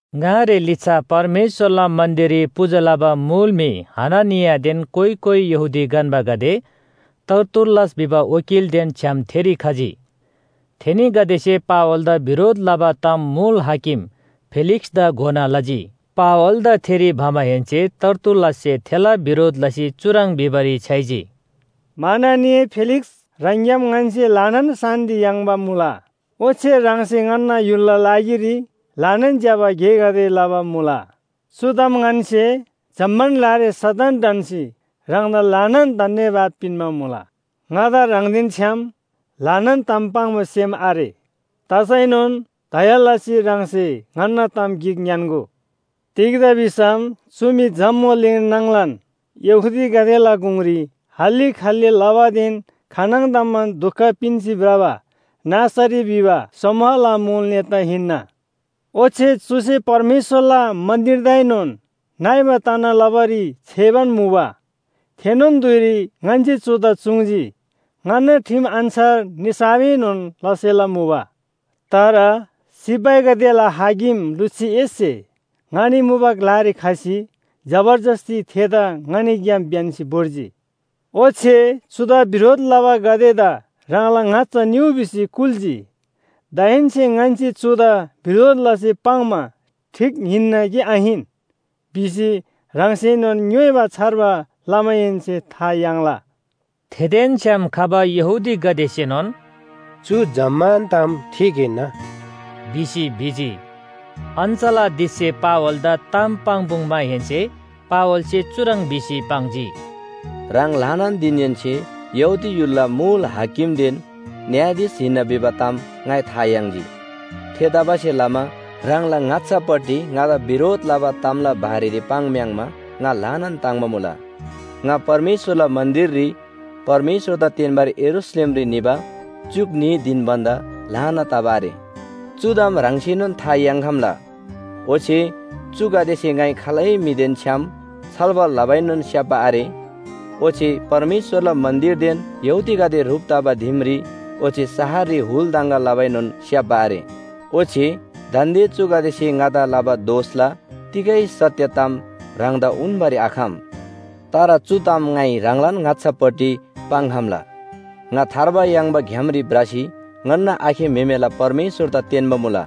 ङारे लिच्‍छा परमेश्‍वरला मन्‍दिररी पूजा लबा मुल म्‍हि हननियादेन कोइ कोइ यहूदी गन्‍बागदे तर्तुल्‍लस भिबा वकीलदेन छ्‌याम थेरी खजी। थेनीगदेसे पावलदा बिरोध लबा ताम मुल हाकिम फेलिक्‍सदा घोना लजी। पावलदा थेरी भमाहेन्‍से तर्तुल्‍लससे थेला बिरोध लसी चुह्रङ् भिबारी छ्‌याइजी, “माननीय फेलिक्‍स ह्राङग्‍याम ङन्‍से ल्‍हानान शान्‍ति याङ्बा मुला। ओच्‍छे ह्राङसे ङन्‍ना य्‍हुलला लागिरी ल्‍हानान ज्‍यबा गेगदे लबा मुला। चु ताम ङन्‍से जम्‍मान ग्‍लारी सदन ढन्‍सी ह्राङदा ल्‍हानान धन्‍यवाद पिन्‍बा मुला। ङादा ह्राङदेन छ्‌याम ल्‍हानान ताम पाङ्बा सेम आरे। तसैनोन दया लसी ह्राङसे ङन्‍ना ताम गिक ङ्‌यान्‍गो। “तिग्‍दा भिसम चु म्‍हि जम्‍बुलिङ नाङलान यहूदीगदेला गुङरी हल्‍ली खल्‍ली लबादेन खानङदमान दुख पिन्‍सी भ्रबा नासरी भिबा समूहला मुल नेता हिन्‍ना। ओच्‍छे चुसे परमेश्‍वरला मन्‍दिरदाएनोन नइबा तना लबारी छ्‌याइबान मुबा। थेनोन धुइरी ङन्‍से चुदा चुङ्‌जी। ङन्‍ना ठिम अन्‍छार निसाफएनोन लसेला मुबा। तर सिपाहीगदेला हाकिम लुसियससे ङनी मुबा ग्‍लारी खसी जबरजस्‍ती थेदा ङनीग्‍याम ब्‍यन्‍सी भोर्जी। ओच्‍छे चुदा बिरोध लबागदेदा ह्राङला ङाच्‍छा निउ भिसी कुल्‍जी। दाहेन्‍से ङन्‍से चुदा बिरोध लसी पाङ्‌मा ठीक हिन्‍ना कि आहिन भिसी ह्राङसेनोन ङ्‌योइबा छार्बा लमाहेन्‍से था याङ्ला।” थेदेन छ्‌याम खबा यहूदीगदेसेनोन “चु जम्‍मान ताम ठीक हिन्‍ना” भिसी भिजी। अञ्‍चलाधीशसे पावलदा ताम पाङ्‌पुङ्‌माहेन्‍से पावलसे चुह्रङ् भिसी पाङ्जी, “ह्राङ ल्‍हानान दिङहेन्‍से यहूदी य्‍हुलला मुल हाकिमदेन न्‍यायाधीश हिन्‍ना भिबा ताम ङाइ था याङ्जी। थेतबासेलमा ह्राङला ङाच्‍छापट्टि ङादा बिरोध लबा तामला बारेरी पाङ्‌म्‍याङ्‌मा ङा ल्‍हानान ताङ्‍बा मुला। ङा परमेश्‍वरला मन्‍दिररी परमेश्‍वरदा तेन्‍बारी यरूशलेमरी निबा च्‍युक न्‍ही धिन भन्‍दा ल्‍हाना तबा आरे। चु ताम ह्राङसेनोन था याङ्‌खम्‍ला। ओच्‍छे चुगदेसे ङाइ खालै म्‍हिगदेदेन छ्‌याम छलफल लबाएनोन स्‍याप्‍बा आरे। ओच्‍छे परमेश्‍वरला मन्‍दिरदेन यहूदीगदे ह्रुप तबा दिमरी ओच्‍छे शहररी हुल दङगा लबाएनोन स्‍याप्‍बा आरे। ओच्‍छे दान्‍दे चुगदेसे ङादा लबा दोषला तिगै सत्‍य ताम ह्राङदा उन्‍बारी आखम। “तर चु ताम ङाइ ह्राङलान ङाच्‍छापट्टि पाङ्‌खम्‍ला। ङा थार्बा याङ्बा ग्‍यामरी भ्रसी ङन्‍ना आखे म्‍हेमेला परमेश्‍वरदा तेन्‍बा मुला।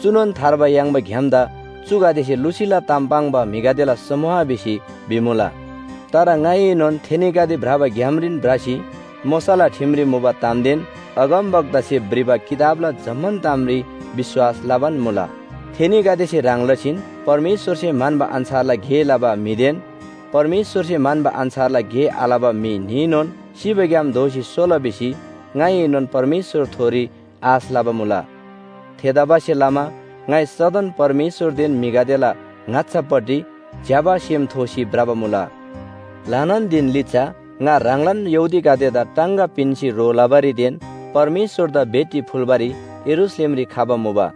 चुनोन थार्बा याङ्बा ग्‍यामदा चुगदेसे लुसीला ताम पाङ्बा म्‍हिगदेला समूह भिसी भिमुला। तर ङाइएनोन थेनीगदे भ्रबा ग्‍यामरीन भ्रसी मोशाला ठिमरी मुबा तामदेन अगमवक्तासे भ्रिबा किताबला जम्‍मान तामरी विश्‍वास लबान मुला। थेनीगदेसे ह्रङ् लसीन परमेश्‍वरसे म्‍हन्‍बा अन्‍छारला गे लबा म्‍हिदेन परमेश्‍वरसे म्‍हन्‍बा अन्‍छारला गे आलबा म्‍हि न्‍हीनोन सिबाग्‍याम दोःसी सोला भिसी ङाइएनोन परमेश्‍वरथोरी आश लबा मुला। थेतबासेलमा ङाइ सदन परमेश्‍वरदेन म्‍हिगदेला ङाच्‍छापट्टि ज्‍यबा सेम थोसी भ्रबा मुला। “ल्‍हानान दिङ लिच्‍छा ङा ह्राङलान यहूदीगदेदा टाङगा पिन्‍सी ह्रो लबारीदेन परमेश्‍वरदा भेटी फुल्‍बारी यरूशलेमरी खबा मुबा।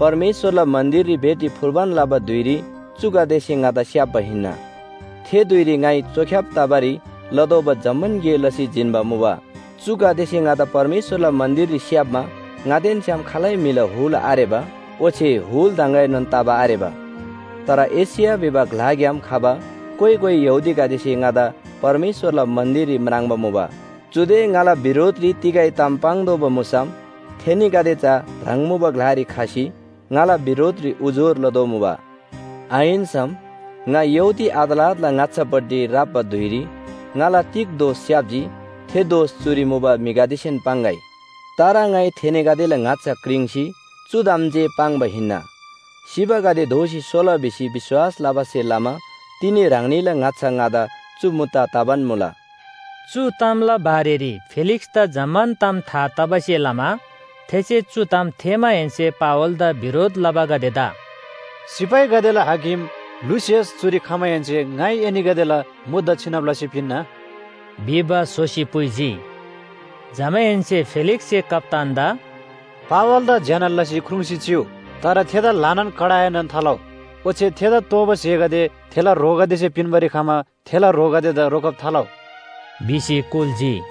परमेश्‍वरला मन्‍दिररी भेटी फुल्‍बान लबा धुइरी चुगदेसे ङादा स्‍याप्‍बा हिन्‍ना। थे धुइरी ङाइ चोख्‍याब तबारी लतोःबा जम्‍मान गे लसी जिन्‍बा मुबा। चुगदेसे ङादा परमेश्‍वरला मन्‍दिररी स्‍याप्‍मा ङादेन छ्‌याम खालै म्‍हिला हुल आरेबा ओच्‍छे हुल दङगाएनोन तबा आरेबा। तर एशिया भिबा ग्‍लाग्‍याम खबा कोइ कोइ यहूदीगदेसे ङादा परमेश्‍वरला मन्‍दिररी म्राङ्बा मुबा। चुदे ङाला बिरोधरी तिगै ताम पाङ्तोःबा मुसम थेनीगदे चा ह्राङ मुबा ग्‍लारी खसी ङाला बिरोधरी उजुर लदोमुबा। आहिन्‍सम, ङा यहूदी अदालतला ङाच्‍छापट्टि राप्‍बा धुइरी ङाला तिग दोष स्‍याप्‍जी थे दोष चुरी मुबा म्‍हिगदेसेन पाङ्‌गै। तर ङाइ थेनीगदेला ङाच्‍छा क्रिङ्सी चु ताम जे पाङ्बा हिन्‍ना, ‘सिबागदे दोःसी सोला’ भिसी विश्‍वास लबासे लमा तिनी ह्राङनीला ङाच्‍छा ङादा चु मुद्दा तबान मुला।” चु तामला बारेरी फेलिक्‍सदा जम्‍मान ताम था तबासे लमा थेसे चु ताम थेःमाहेन्‍से पावलदा बिरोध लबागदेदा “सिपाहीगदेला हाकिम लुसियस चुरी खमाहेन्‍से ङाइ एनीगदेला मुद्दा छिनब लसी पिन्‍ना” भिबा स्‍होसी पुइजी। जमाहेन्‍से फेलिक्‍ससे कप्‍तानदा “पावलदा ज्‍यना लसी ख्रुङ्‌सी चिउ, तर थेदा ल्‍हानान कडाएनोन थालउ। ओच्‍छे थेदा तोःबा स्‍हेगदे थेला ह्रोगदेसे पिन्‍बारी खमा थेला ह्रोगदेदा रोकब थालउ” भिसी कुल्‍जी।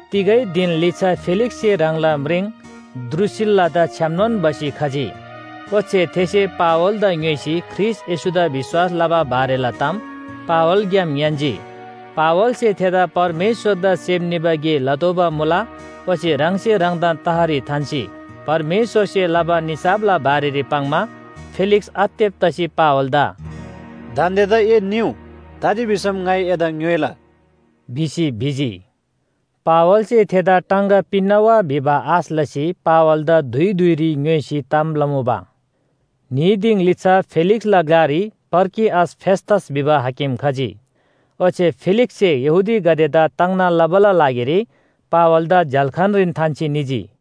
तिगै धिन लिच्‍छा फेलिक्‍ससे ह्राङला यहूदी म्रिङ द्रूसिल्‍लादा छ्‌यामनोन भसी खजी, ओच्‍छे थेसे पावलदा ङ्‌योइसी ख्रीष्‍ट येशूदा विश्‍वास लबा बारेला ताम पावलग्‍याम ङ्‌यान्‍जी। पावलसे थेदा परमेश्‍वरदा सेम निबा गे लतोःबा मुला ओच्‍छे ह्राङसे ह्राङदान तहरी थान्‍सी परमेश्‍वरसे लबा निसाफला बारेरी पाङ्‌मा फेलिक्‍स आत्तेब तसी पावलदा “दान्‍देदा ए निउ, तजी भिसम ङाइ एदा ङ्‌योइला” भिसी भिजी। पावलसे थेदा टाङगा पिन्‍ना वा भिबा आश लसी पावलदा धुइ धुइरी ङ्‌योइसी ताम लमुबा। न्‍ही दिङ लिच्‍छा फेलिक्‍सला ग्‍लारी पर्किअस फेस्‍तस भिबा हाकिम खजी। ओच्‍छे फेलिक्‍ससे यहूदीगदेदा ताङ्ना लबाला लागिरी पावलदा झ्‍याल्‍खानरीन थान्‍सी निजी।